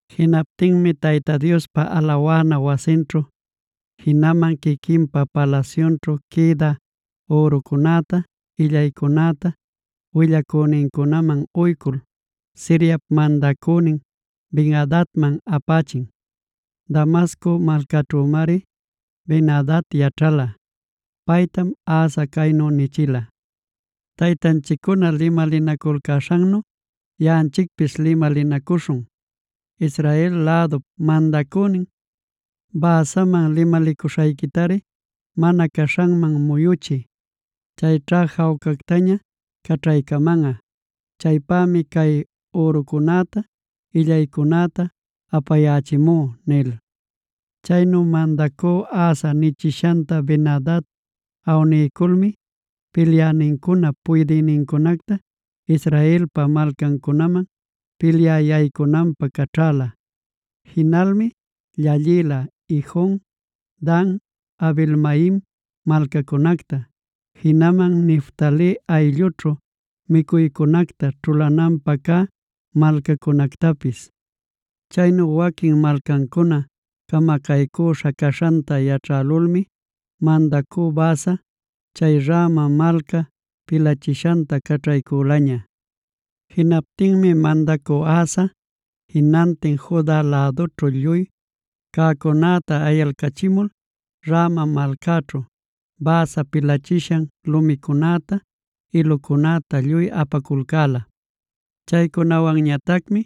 Jinaptinmi Tayta Diospa alawana wasinćhu, jinaman quiquinpa palasyunćhu quïdä ürucunäta, illaycunäta willacünincunaman uycul, Siriap mandacünin Ben-adadman apächin. Damasco malcaćhümari Ben-adad yaćhala. Paytam Asa caynu nichila: “Taytanchiccuna limalinaculcäśhannu yaꞌanchicpis limalinacuśhun. Israel lädup mandacünin Baasaman limalicuśhayquitari mana caśhanman muyuchiy; chayćha jawcactaña caćhaycamanꞌa. Chaypämi cay ürucunäta, illaycunäta apayächimú” nil. Chaynu mandacü Asa nichishanta Ben-adad awniyculmi pilyänincunap puydïnincunacta Israelpa malcancunaman pilyä yaycunanpä caćhäla. Jinalmi llallïla Ijon, Dan, Abel-maim malcacunacta, jinaman Neftali ayllućhu micuycunacta ćhulananpä cä malcacunactapis. Chaynu waquin malcancuna camacaycüśha caśhanta yaćhälulmi mandacü Baasa, chay Rama malca pilachishanta caćhaycülaña. Jinaptinmi mandacü Asa, jinantin Juda lädućhu lluy cäcunäta ayalcachimul Rama malcaćhu, Baasa pilachishan lumicunäta, ilucunäta lluy apaculcäla. Chaycunawanñatacmi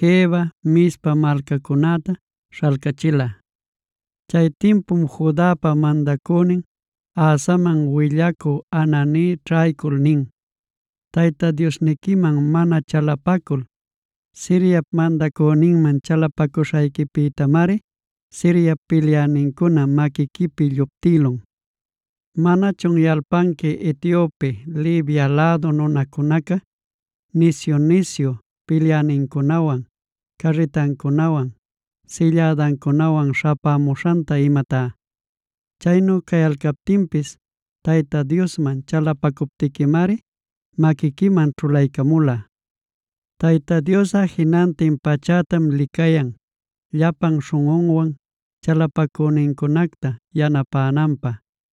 Geba, Mizpa malcacunäta śhalcachila. Chay timpum Judapa mandacünin Asaman willacü Hanani ćhaycul nin: “Tayta Diosniquiman mana chalapacul Siriap mandacüninman chalapacuśhayquipïtamari Siriap pilyänincuna maquiquipi lluptïlun. ¿Manachun yalpanqui Etiope, Libia lädu nunacunaca nisyu-nisyu pilyänincunawan, carritancunawan, sillädancunawan śhapämuśhanta imatá? Chaynu cayalcaptinpis Tayta Diosman chalapacuptiquimari maquiquiman ćhulaycamula. Tayta Diosꞌa jinantin pachätam licayan llapan śhunꞌunwan chalapacünincunacta yanapänanpä.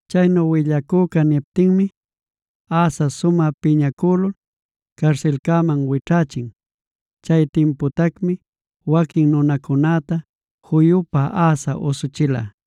Chaynu willacüca niptinmi, Asa sumä piñacülul carsilcäman wićhächin. Chay timputacmi waquin nunacunäta juyupa Asa usuchila.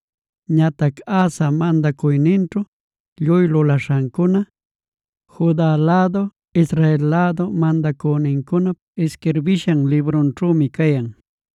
Ñatac Asa mandacuyninćhu lluy lulaśhancuna Juda lädu, Israel lädu mandacünincunap isquirbishan librunćhümi cayan.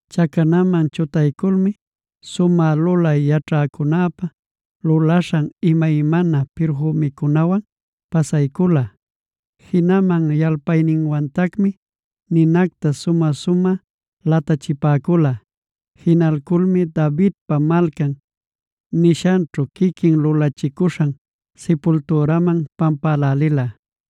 Chacanaman chutayculmi sumä lulay yaćhäcunäpa lulaśhan imaymana pirfümicunawan pasaycula. Jinaman yalpayninwantacmi ninacta sumä-sumä latachipäcula. Jinalculmi Davidpa Malcan nishanćhu quiquin lulachicuśhan sipultüraman pampälälila.